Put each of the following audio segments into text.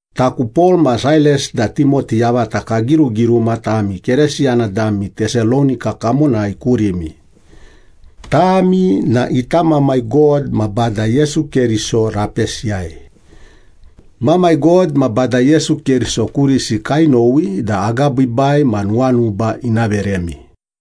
Taku Pol, ma Sailas da Timoti yavata kagirugiruma tami Keresiyana dami Tesalonika kamonai kurimi. Tami na ita Mamai God ma Bada Yesu Keriso rapesiyai. Mamai God ma Bada Yesu Keriso kurisi kainowi da agabiibai ma nuwanuba ina veremi.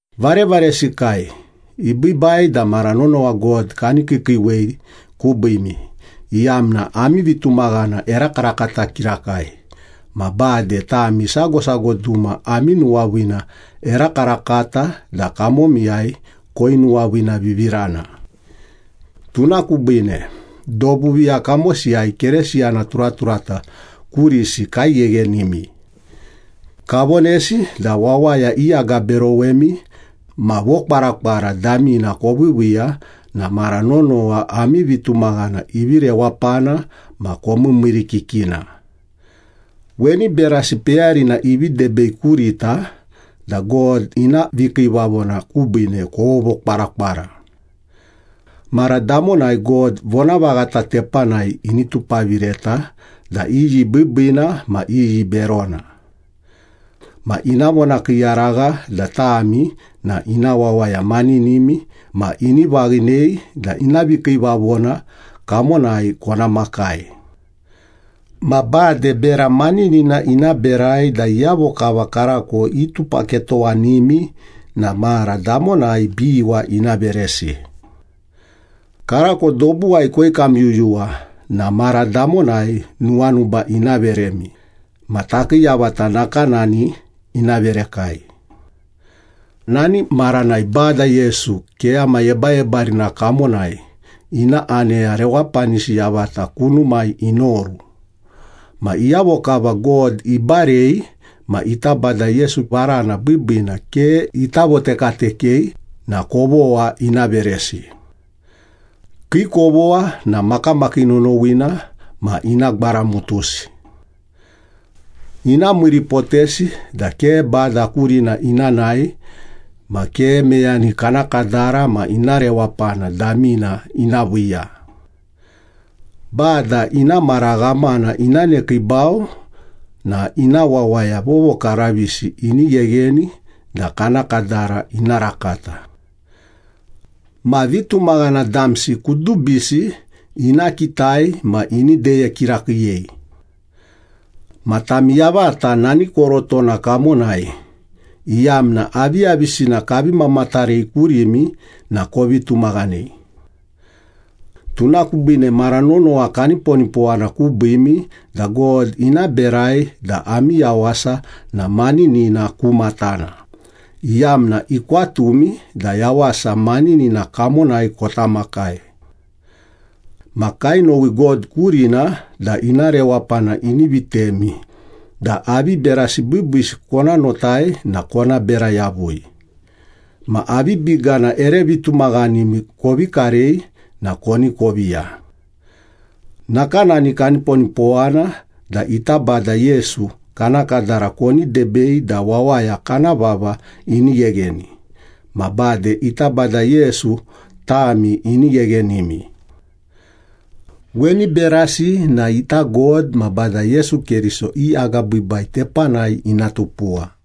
Varevaresikai, ibiibai da mara nonowa God kani kiikiiwei kubiimi, iyamna ami vitumaghana erakarakata kirakai, ma bade tami sago sago duma ami nuwaviina erakarakata da kamomiyai koinuwaviinavivirana. Tuna kubiine, dobu viya kamosiyai Keresiyana turaturata kurisi kaigheghenimi. Kavonesi da wawaya iagaberowemi ma vokwarakwara damina koviiviiya na mara nonowa ami vitumaghana ivi rewapana ma komiimiirikikina. Weni berasi peyarina ivi debei kurita da God ina vikiivavona kubiine kovovokwarakwara. Mara damonai God vonavaghata tepanai ini tupavireta da iyi biibiina ma iyi berona. Ma ina vonakiiyaragha da tami na ina wawaya maninimi ma ini vaghinei da ina vikiivavona kamonai kona makai. Ma bade bera maninina ina berai da iyavo kava karako itupaketowanimi na mara damonai biwa ina veresi. Karako dobuwai koikamyuyuwa na mara damonai nuwanuba ina veremi, ma takii yavata nakanani ina verekai. Nani maranai Bada Yesu keyama yebayebarina kamonai, ina aneya rewapanisi yavata kunumai inoru. Ma iyavo kava God ibarei ma ita Bada Yesu varana biibiina ke ita votekatekei na kovogha ina veresi. Kii kovogha na makamakii nonowina ma ina gwaramutusi. Ina miiripotesi da ke Bada kurina ina nae ma ke meyani kana kadara ma ina rewapana damina ina viiya. Bada ina mara ghamana ina nekiibau na ina wawaya vovokaravisi ini ghegheni da kana kadara ina rakata. Ma vitumaghana damsi kudubisi ina kitai ma ini deye kirakiiyei. Ma tami yavata nani korotona kamonai, iyamna aviyavisina kavi mamatarei kurimi na kovi tumaghanei. Tuna kubiine mara nonowa kaniponipowana kubiimi da God ina berai da ami yawasa na maninina ku matana, iyamna ikwatumi da yawasa maninina kamonai kota makai. Ma kainowi God kurina da ina rewapana ini vitemi da avi berasi biibiisi kona notai na kona bera yavui, ma avi bigana ere vitumaghanimi kovi karei na koni koviya. Nakanani kaniponipowana da ita Bada Yesu kana kadara koni debei da wawaya kana vava ini ghegheni, ma bade ita Bada Yesu tami ini gheghenimi. Weni berasi na ita God ma Bada Yesu Keriso i agabiibai tepanai ina tupuwa.